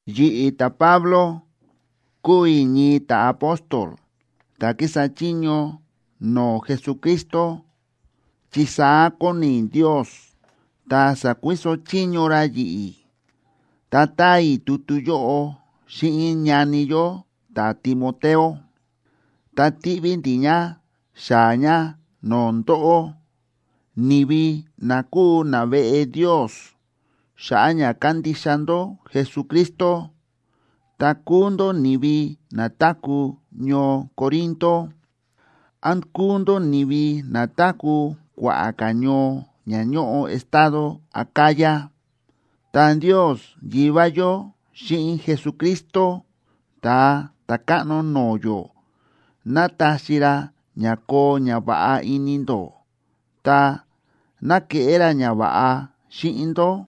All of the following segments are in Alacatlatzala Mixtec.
Yi̱ꞌi̱, ta̱Pablo, kúu i̱ ñii ta̱apóstol ta̱ kísa chiño no̱o̱ Jesucristo, chi saá kóni Ndios, ta sa̱kuiso chiño ra yi̱ꞌi̱. Ta táa i̱ tutu yóꞌo xíꞌin ñani yó ta̱Timoteo, ta tíꞌví ndi̱ ña xaa̱ ña no̱o̱ ndóꞌó, ni̱vi na kúu naveꞌe Ndios xa̱ꞌa̱ ña kándixa ndó Jesucristo, ta kúu ndó ni̱vi na táku̱ ñoo Corinto, án kúu ndó ni̱vi na táku̱ kua̱ꞌa̱ ka̱ ñoo ña ñóꞌo estado Acaya. Ta Ndios Yivá yó xíꞌin Jesucristo Ta̱a Ta̱káꞌno no̱o̱ yó, ¡ná taxi ra ña koo ñava̱ꞌa ini ndó! Ta, ¡ná keꞌé ra ñava̱ꞌa xíꞌin ndó!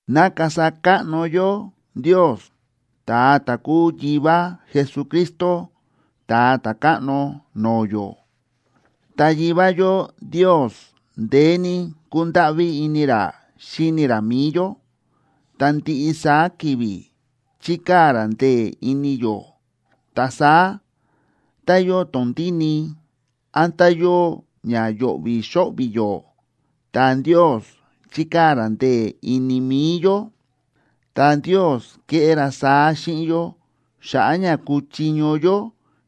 ¡Na kasa káꞌno yó Ndios, ta̱a ta̱ kúu Yivá Jesucristo, Ta̱a Ta̱káꞌno no̱o̱ yó! Ta Yivá yó Ndios ndeé ní kúndáꞌví ini ra xíni ra mi̱i yó, ta ndiꞌi saá ki̱vi̱ chíkaa̱ ra ndee̱ ini yó. Ta saá, tá yóo tondíni, án tá yóo ña yo̱ꞌvi̱ xóꞌvi̱ yó, ta Ndios chíkaa̱ ra ndee̱ ini mi̱i yó. Ta Ndios kéꞌé ra saá xíꞌin yó xa̱ꞌa̱ ña kuchiño yó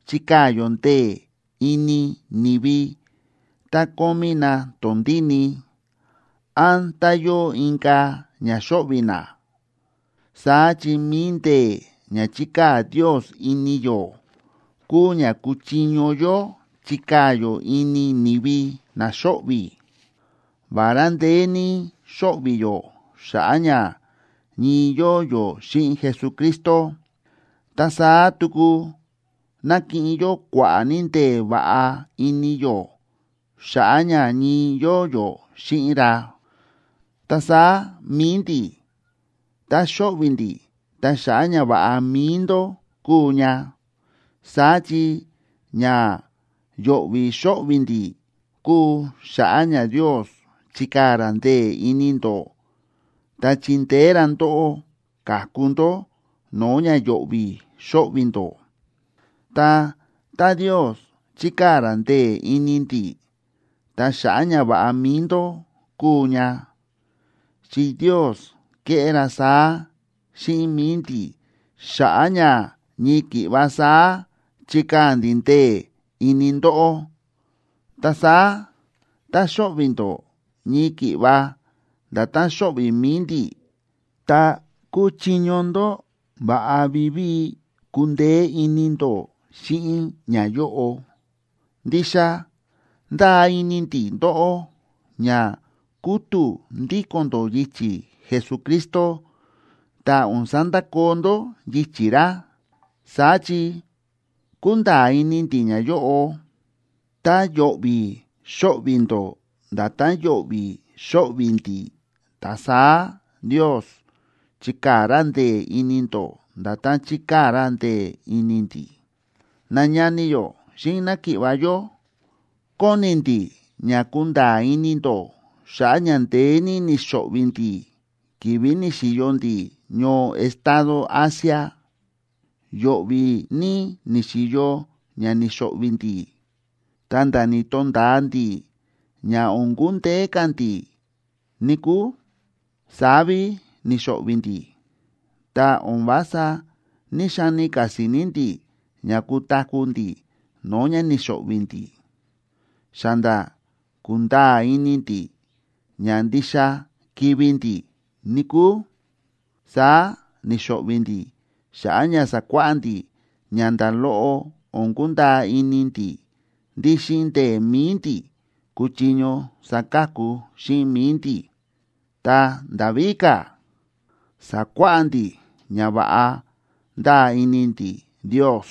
chikaa̱ yó ndee̱ ini ni̱vi tá kómí na tondíni, án tá yóo inka̱ ña xóꞌvi̱ na. Saá chi mi̱i ndee̱ ña chíkaa̱ Ndios ini yó, kúu ña kúchiño yó chikaa̱ yó ini ni̱vi na xóꞌvi̱. Vará ndeé ní xóꞌvi̱ yó xa̱ꞌa̱ ña ñii yóo yó xíꞌin Jesucristo, ta saá tuku nákiꞌin yó kua̱ꞌa̱ ní ndee̱ va̱ꞌa ini yó xa̱ꞌa̱ ña ñii yóo yó xíꞌin ra. Ta saá mi̱i ndi̱, tá xóꞌvi̱ ndi̱, ta xa̱ꞌa̱ ñava̱ꞌa mi̱i ndó kúu ña. Saá chi ña yo̱ꞌvi̱ xóꞌvi̱ ndi̱ kúu xa̱ꞌa̱ ña Ndios chikaa̱ ra ndee̱ ini ndó ta chindeé ra ndóꞌó ka̱ku ndó no̱o̱ ña yo̱ꞌvi̱ xóꞌvi̱ ndó. Ta tá Ndios chíkaa̱ ra ndee̱ ini ndi̱, ta xa̱ꞌa̱ ñava̱ꞌa mi̱i ndó kúu ña, chi Ndios kéꞌé ra saá xíꞌin mi̱i ndi̱ xa̱ꞌa̱ ña ñii ki̱ꞌva saá chikaa̱ ndi̱ ndee̱ ini ndóꞌó. Ta saá tá xóꞌvi̱ ndó ñii ki̱ꞌva nda̱tán xóꞌvi̱ mi̱i ndi̱, ta kúchiño ndó va̱ꞌa vivíi kundeé ini ndó xíꞌin ñayóꞌo. Ndixa ndáa ini ndi̱ ndóꞌó ña kútu̱ ndíko̱n ndó yichi̱ Jesucristo ta o̱n sandakoo ndó yichi̱ ra. Saá chi kúnda̱a̱ ini ndi̱ ñayóꞌo: tá yo̱ꞌvi̱ xóꞌvi̱ ndó nda̱tán yo̱ꞌvi̱ xóꞌvi̱ ndi̱, ta saá Ndios chikaa̱ ra ndee̱ ini ndó nda̱tán chíkaa̱ ra ndee̱ ini ndi̱. Nañani yó xíꞌin náki̱ꞌva̱ yó, kóni ndi̱ ña kunda̱a̱ ini ndó xa̱ꞌa̱ ña ndeé ní ni̱xo̱ꞌvi̱ ndi̱ ki̱vi̱ ni̱xi̱yo ndi̱ ñoo estado Asia. Yo̱ꞌvi̱ ní ni̱xi̱yo ña ni̱xo̱ꞌvi̱ ndi̱, ta̱nda̱ ni̱to̱nda̱a ndi̱ ña o̱n kundeé ka̱ ndi̱, níkúu, saá ví ni̱xo̱ꞌvi̱ ndi̱. Ta o̱n vása ní‑xani ka̱ si̱ni̱ ndi̱ ña kutaku̱ ndi̱ no̱o̱ ña ni̱xo̱ꞌvi̱ ndi̱. Xa nda̱ ku̱nda̱a̱ ini ndi̱ ña ndixa kivi̱ ndi̱, níkúu. Saá ni̱xo̱ꞌvi̱ ndi̱ xa̱ꞌa̱ ña sakuáꞌá ndi̱ ña nda̱ loꞌo o̱n kundaa ini ndi̱ ndí xíꞌin ndee̱ mi̱i ndi̱ kuchiño saka̱ku xíꞌin mi̱i ndi̱, ta nda̱ víka̱, sa̱kuáꞌá ndi̱ ña va̱ꞌa ndáa ini ndi̱ Ndios,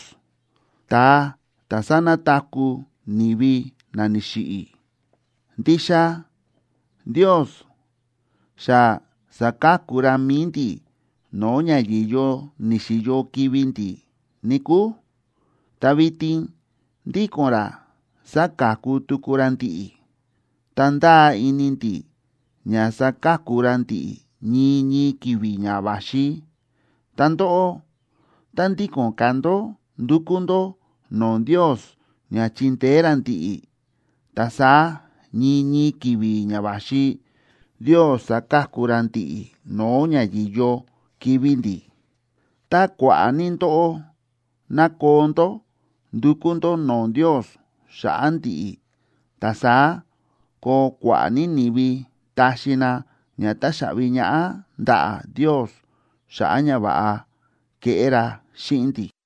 ta̱a ta̱ sánataku̱ ni̱vi na ni̱xiꞌi̱. Ndixa Ndios xa sa̱ka̱ku ra mi̱i ndi̱ no̱o̱ ña yi̱yo ni̱xi̱yo kivi̱ ndi̱, níkúu, ta vitin ndíko̱n ra sáka̱ku tuku ra ndi̱ꞌi̱. Ta ndáa ini ndi̱ ña saka̱ku ra ndi̱ꞌi̱ ñii ñii ki̱vi̱ ña va̱xi. Ta ndóꞌó, tá ndíko̱n ka̱ ndó ndúkú ndó no̱o̱ Ndios ña chindeé ra ndi̱ꞌi̱, ta saá ñii ñii ki̱vi̱ ña va̱xi Ndios saka̱ku ra ndi̱ꞌi̱ no̱o̱ ña yi̱yo kivi̱ ndi̱. Tá kua̱ꞌa̱ ní ndóꞌó ná koo ndó ndukú ndó no̱o̱ Ndios xa̱ꞌa̱ ndi̱ꞌi̱, ta saá koo kua̱ꞌa̱ ní ni̱vi taxi na ña táxaꞌvi ñaꞌá ndaꞌa̱ Ndios xa̱ꞌa̱ ñava̱ꞌa keꞌé ra xíꞌin ndi̱.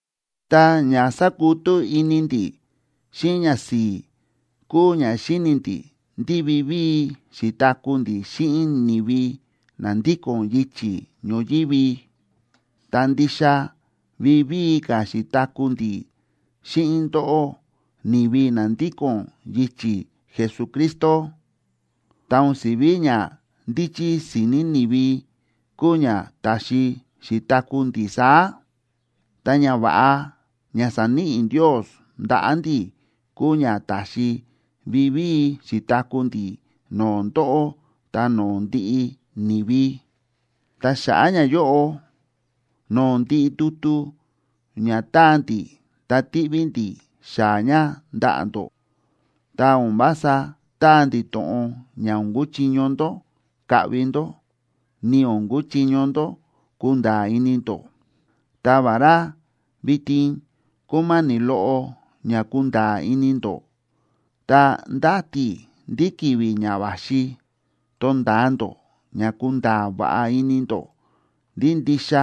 Ta ña sákutú ini ndi̱ xíꞌin ñasi̱i̱ kúu ña xíni̱ ndi̱ ndí vivíi xi̱taku̱ ndi̱ xíꞌin ni̱vi na ndíko̱n yichi̱ ñoyívi, ta ndixa vivíi ka̱ xi̱taku̱ ndi̱ xíꞌin ndóꞌó, ni̱vi na ndíko̱n yichi̱ Jesucristo. Ta o̱n si̱ví ñandíchí si̱ni̱ ni̱vi kúu ña ta̱xi xi̱taku̱ ndi̱ saá, ta ñava̱ꞌa ña sa̱níꞌi Ndios ndaꞌa̱ ndi̱ kúu ña ta̱xi vivíi xi̱taku̱ ndi̱ no̱o̱ ndóꞌó ta no̱o̱ ndiꞌi ni̱vi. Ta xa̱ꞌa̱ ñayóꞌo, no̱o̱ ndiꞌi tutu ña táa ndi̱ ta tíꞌví ndi̱ xaa̱ ña ndaꞌa̱ ndó, ta o̱n vása táa ndi̱ to̱ꞌon ña o̱n kuchiño ndó kaꞌvi ndó, ni o̱n kuchiño ndó kunda̱a̱ ini ndó. Ta vará, vitin kúma̱ni̱ loꞌo ña kunda̱a̱ ini ndó, ta ndáti i̱ ndí ki̱vi̱ ña va̱xi tonda̱a ndó ña kunda̱a̱ va̱ꞌa ini ndó ndí ndixa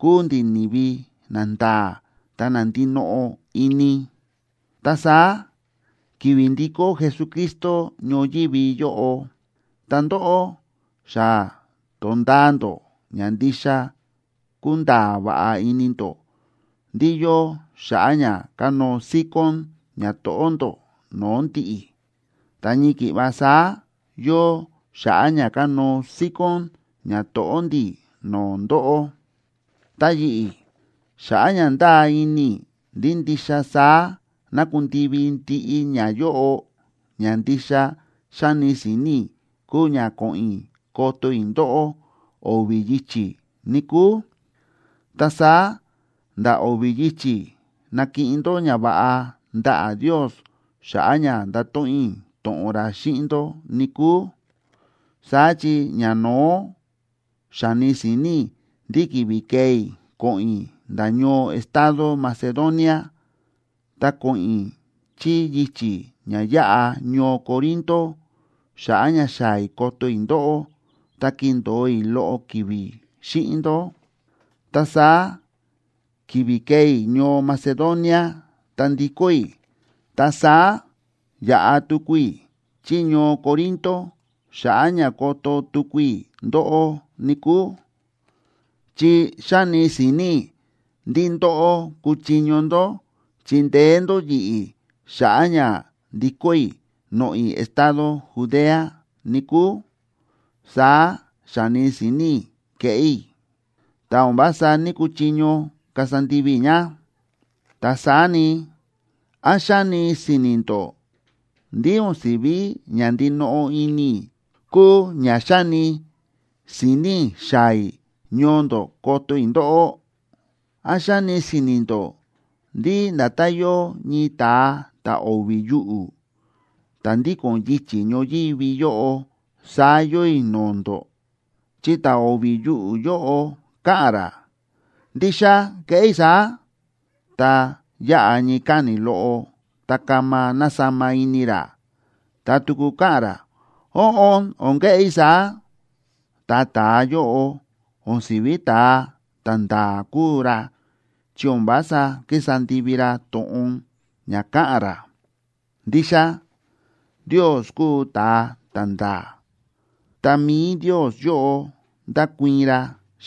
kúu ndi̱ ni̱vi nanda̱a̱ ta na ndinoꞌo ini. Ta saá ki̱vi̱ ndikó Jesucristo ñoyívi yóꞌo, ta ndóꞌó xa to̱nda̱a ndó ña ndixa kúnda̱a̱ va̱ꞌa ini ndó ndí yóo xa̱ꞌa̱ ña kanóo síkón ñato̱ꞌó ndó no̱o̱ ndi̱ꞌi̱, ta ñii ki̱ꞌva saá yóo xa̱ꞌa̱ ña kanóo síkón ñato̱ꞌó ndi̱ no̱o̱ ndóꞌó. Ta yi̱ꞌi̱, xa̱ꞌa̱ ña ndáa ini i̱ ndí ndixa saá ná kundivi ndiꞌi ñayóꞌo, ña ndixa xa̱ni si̱ni̱ i̱ kúu ña ko̱ꞌo̱n i̱ koto i̱ ndóꞌó o̱vi̱ yichi̱, níkúu. Ta saá nda̱ o̱vi̱ yichi̱ nakiꞌin ndó ñava̱ꞌa ndaꞌa̱ Ndios xa̱ꞌa̱ ña ndato̱ꞌon i̱ to̱ꞌon ra xíꞌin ndó, níkúu. Saá chi ñano̱ó xa̱ni si̱ni̱ i̱ ndí ki̱vi̱ kee i̱ ko̱ꞌo̱n i̱ nda̱ ñoo estado Macedonia, ta ko̱ꞌo̱n i̱ chí yichi̱ ña yáꞌa ñoo Corinto xa̱ꞌa̱ ña xaa̱ i̱ koto i̱ ndóꞌó ta kindo̱o i̱ loꞌo ki̱vi̱ xíꞌin ndó. Ta saá ki̱vi̱ kee i̱ ñoo Macedonia ta ndikó i̱, ta saá yaꞌa tuku i̱ chí ñoo Corinto xa̱ꞌa̱ ña koto tuku i̱ ndóꞌó, níkúu. Chi xa̱ni si̱ni̱ i̱ ndí ndóꞌó kuchiño ndó chindeé ndó yi̱ꞌi̱ xa̱ꞌa̱ ña ndikó i̱ noꞌo̱ i̱ estado Judea, níkúu. Saá xa̱ni si̱ni̱ i̱ keꞌé i̱, ta o̱n vása ní‑kuchiño kasa ndivi i̱ ña. Ta saá ni, ¿án xáni si̱ni̱ ndó ndí o̱n si̱ví ña ndinoꞌo ini i̱ kúu ña xa̱ni si̱ni̱ i̱ xaa̱ i̱ ñoo ndó koto i̱ ndóꞌó? ¿Án xáni si̱ni̱ ndó ndí nda̱tán yóo ñii ta̱a ta̱ o̱vi̱ yuꞌu̱, ta̱ ndíko̱n yichi̱ ñoyívi yóꞌo, saá yóo i̱ no̱o̱ ndó? Chi ta̱ o̱vi̱ yuꞌu̱ yóꞌo káꞌa̱n ra: “Ndixa keꞌé i̱ saá”, ta yáꞌa ñii káni̱ loꞌo ta kama násama ini ra, ta tuku káꞌa̱n ra: “Óꞌon, o̱n keꞌé i̱ saá”, ta ta̱a yóꞌo o̱n si̱ví ta̱a ta̱nda̱a̱ kúu ra chi o̱n vása kísa ndivi ra to̱ꞌon ña káꞌa̱n ra. Ndixa Ndios kúu ta̱a ta̱nda̱a̱, ta mi̱i Ndios yóꞌo ndákuii̱n ra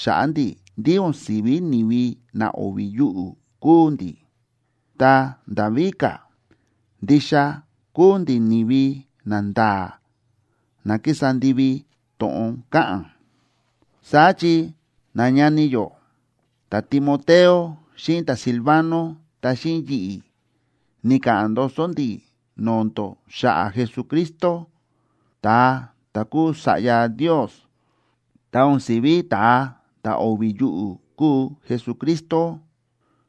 xa̱ꞌa̱ ndi̱ ndí o̱n si̱ví ni̱vi na o̱vi̱ yuꞌu̱ kúu ndi̱. Ta nda̱ víka̱, ndixa kúu ndi̱ ni̱vi nanda̱a̱ na kísa ndivi to̱ꞌon káꞌa̱n. Saá chi nañani yó ta̱Timoteo xíꞌin ta̱Silvano ta xíꞌin yi̱ꞌi̱ ni̱ka̱ꞌa̱n ndoso ndi̱ no̱o̱ ndó xa̱ꞌa̱ Jesucristo, ta̱a ta̱ kúu Sa̱ꞌya Ndios. Ta o̱n si̱ví ta̱a ta̱ o̱vi̱ yuꞌu̱ kúu Jesucristo.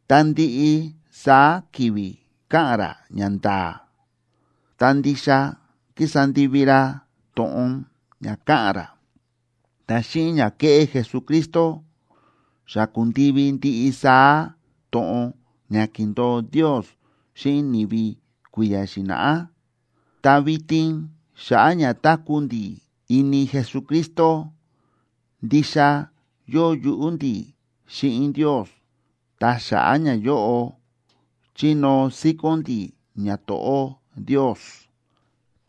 Ta ndiꞌi saá ki̱vi̱ káꞌa̱n ra ñanda̱a̱, ta ndixa kísa ndivi ra to̱ꞌon ña káꞌa̱n ra. Ta xíꞌin ña ke̱ꞌé Jesucristo, xa ku̱ndivi ndiꞌi saá to̱ꞌon ña ki̱ndo̱o Ndios xíꞌin ni̱vi kui̱ya̱ xi̱na̱ꞌá. Ta vitin xa̱ꞌa̱ ña táku̱ ndi̱ ini Jesucristo, ndixa yóo yuꞌú ndi̱ xíꞌin Ndios, ta xa̱ꞌa̱ ñayóꞌo chínóo síkón ndi̱ ñato̱ꞌó Ndios.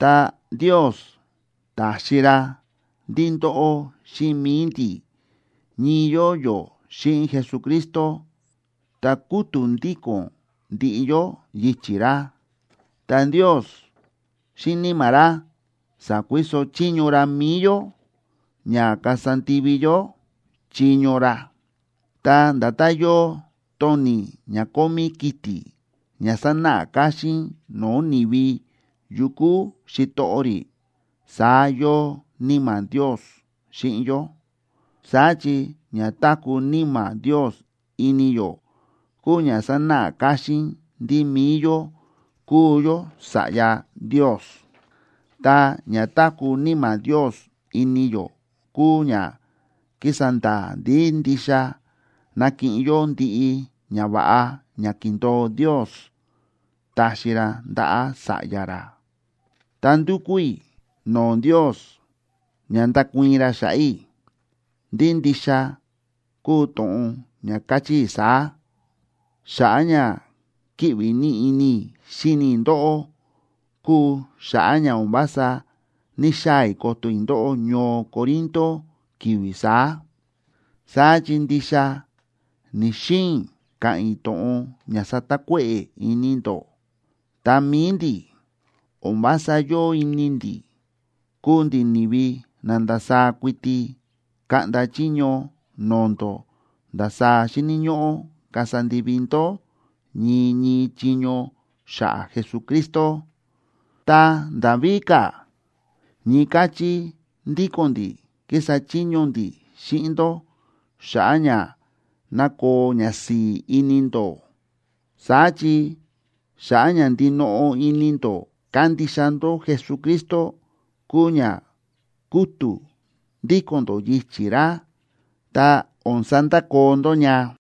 Ta Ndios ta̱xi ra ndí ndóꞌó xíꞌin mi̱i ndi̱ ñii yóo yó xíꞌin Jesucristo ta kútu̱ ndíko̱n ndiꞌi yó yichi̱ ra. Ta Ndios xíꞌin Níma̱ ra sa̱kuiso chiño ra mi̱i yó ña kasa ndivi yó chiño ra. Ta nda̱tán yóo toni̱ ña kómí kiti̱, ña sánáꞌa káxín no̱o̱ ni̱vi yu kúu xitoꞌo rí, saá yóo Níma̱ Ndios xíꞌin yó. Saá chi ña táku̱ Níma̱ Ndios ini yó kúu ña sánáꞌa káxín ndí mi̱i yó kúu yó sa̱ꞌya Ndios. Ta ña táku̱ Níma̱ Ndios ini yó kúu ña kísa nda̱a̱ ndí ndixa nakiꞌin yó ndiꞌi ñava̱ꞌa ña ki̱ndo̱o Ndios taxi ra ndaꞌa̱ sa̱ꞌya ra. Ta ndúkú i̱ no̱o̱ Ndios ña ndakuii̱n ra xa̱ꞌa̱ i̱ ndí ndixa kúu to̱ꞌon ña káchí i̱ saá: xa̱ꞌa̱ ña kíꞌvi ní ini i̱ xíni i̱ ndóꞌó kúu xa̱ꞌa̱ ña o̱n vása ní‑xaa̱ i̱ koto i̱ ndóꞌó ñoo Corinto ki̱vi̱ saá. Saá chi ndixa ni̱‑xiin i̱ ka̱ꞌa̱n i̱ to̱ꞌon ña satakuéꞌe̱ ini ndó. Ta mi̱i ndi̱, o̱n vása yóo ini ndi̱ kuu ndi̱ ni̱vi na ndasaá kuiti kaꞌnda chiño no̱o̱ ndó ndasaá xíni̱ ñóꞌó kasa ndivi ndó ñii ñii chiño xa̱ꞌa̱ Jesucristo. Ta nda̱ víka̱, ñii káchí ndíko̱n ndi̱ kísa chiño ndi̱ xíꞌin ndó xa̱ꞌa̱ ña ná koo ñasi̱i̱ ini ndó. Saá chi xa̱ꞌa̱ ña ndinoꞌo ini ndó kándixa ndó Jesucristo kúu ña kútu̱ ndíko̱n ndó yichi̱ ra, ta o̱n sandakoo ndó ña.